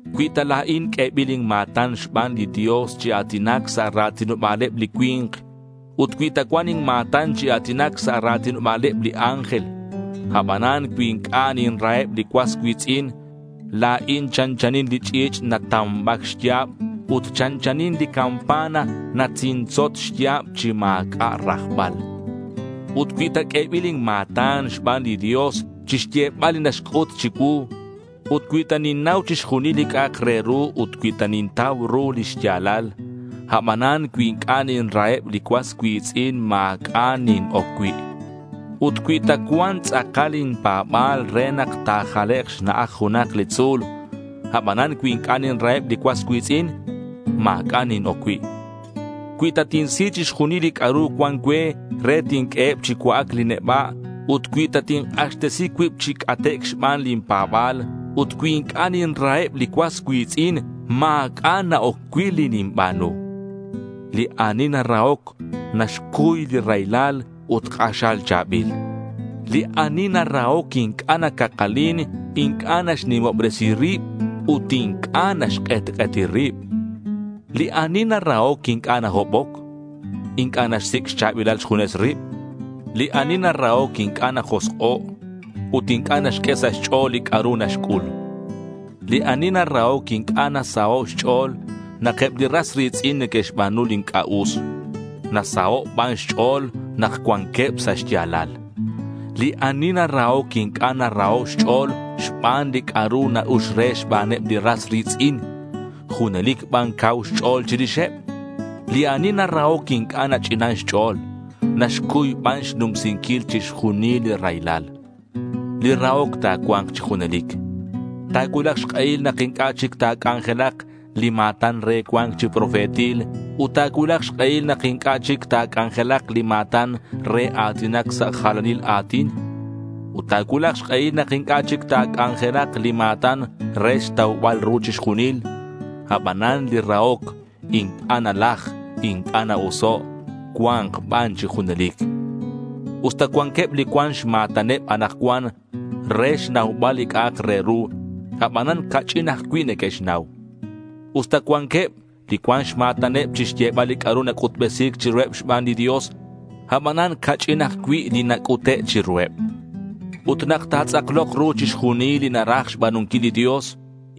Cui ta la̱in q'uebil inma̱tan xban li Dios chi a̱tinac sa' ra̱tinoba̱leb li cui̱nk ut cui ta cuan inma̱tan chi a̱tinac sa' ra̱tinoba̱leb li ángel, abanan cui inc'a' ninraheb li cuas cui̱tz'in, la̱in chanchanin li ch'i̱ch' natamba̱c xya̱b ut chanchanin li campana natzintzot xya̱b chi ma̱c'a' rajbal. Ut cui ta q'uebil inma̱tan xban li Dios chixyebal li naxc'ut chicuu, ut cui ta ninnau chixjunil li c'a'ak re ru ut cui ta nintau ru li xya̱lal, abanan cui inc'a' ninraheb li cuas cui̱tz'in ma̱c'a' nin-oc cui'. Ut cui ta cuan tz'akal inpa̱ba̱l re nak ta̱jalek' xna'aj junak li tzu̱l, abanan cui inc'a' ninraheb li cuas cui̱tz'in, ma̱c'a' nin-oc cui'. Cui ta tinsi chixjunil li c'a'ru cuan cue re tinq'ueheb chi cua'ac li neba' ut cui ta tink'axtesi cuib chi c'atec' xban lin pa̱ba̱l, ut cui inc'a' ninraheb li cuas cui̱tz'in, ma̱c'a' na-oc cui' li ninba̱nu. Li ani narahoc, naxcuy li raylal ut k'axal cha̱bil. Li ani narahoc inc'a' nacakalin, inc'a' naxnimobresi rib ut inc'a' naxk'etk'eti rib. Li ani narahoc inc'a' nahoboc. Inc'a' naxsic' xcha̱bilal xjunes rib. Li ani narahoc inc'a' najosk'o' ut inc'a' naxq'ue sa' xch'o̱l li c'a'ru naxc'ul. Li ani narahoc inc'a' nasaho' xch'o̱l nak eb li ras ri̱tz'in neque'xba̱nu li inc'a' us. Nasaho' ban xch'o̱l nak cuanqueb sa' xya̱lal. Li ani narahoc inc'a' naraho' xch'o̱l xban li c'a'ru na-ux re xbaneb li ras ri̱tz'in. Junelic ban cau xch'o̱l chirixeb. Li ani narahoc inc'a' nach'inan xch'o̱l. Naxcuy ban xnumsinquil chixjunil li raylal. Li rahoc ta̱cua̱nk chi junelic. Ta̱cuulak xk'ehil nak inc'a' chic ta̱c'anjelak li ma̱tan re cua̱nc chi profetil ut ta̱cuulak xk'ehil nak inc'a' chic ta̱c'anjelak li ma̱tan re a̱tinac sa' jalanil a̱tin. Ut ta̱cuulak xk'ehil nak inc'a' chic ta̱c'anjelak li ma̱tan re xtaubal ru chixjunil. Abanan li rahoc inc'a' nalaj, inc'a' na-oso'. Cua̱nk ban chi junelic. Usta cuanqueb li cuan xma̱taneb anakcuan re xnaubal li c'a'ak re ru, abanan ca'ch'in ajcui' neque'xnau. Usta cuanqueb li cuan xma̱taneb chixyebal li c'a'ru nac'utbesi̱c chiruheb xban li Dios, abanan ca'ch'in ajcui' li nac'ute' chiruheb. Ut nak ta̱tz'aklok ru chixjunil li naraj xba̱nunquil li Dios,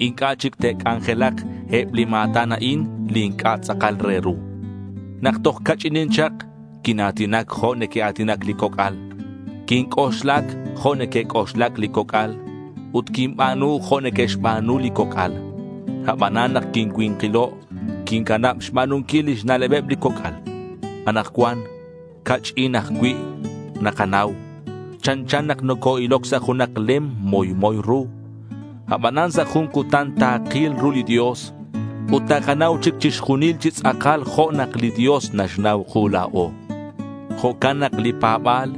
inc'a' chic te'c'anjelak eb li ma̱tan a'in li inc'a' tz'akal re ru. Nak toj ca'ch'inin chak quina̱tinac jo' neque'a̱tinac li coc'al. Quinc'oxlac jo' neque'c'oxlac li coc'al. Ut quinba̱nu jo' neque'xba̱nu li coc'al. Abanan nak quincui̱nkilo' quincanab xba̱nunquil lix na'lebeb li coc'al. Anakcuan ca'ch'in ajcui' nakanau. Chanchan nak noco-iloc sa' junak lem moymoy ru. Abanan sa' jun cutan takil ru li Dios ut takanau chic chixjunil chi tz'akal jo' nak li Dios naxnau ku la̱o. Jo'can nak li pa̱ba̱l,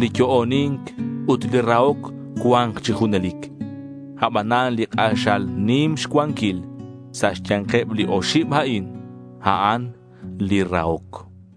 li yo'oni̱nc ut li rahoc cua̱nk chi junelic. Abanan li k'axal nim xcuanquil sa' xya̱nkeb li oxib a'in, a'an li rahoc.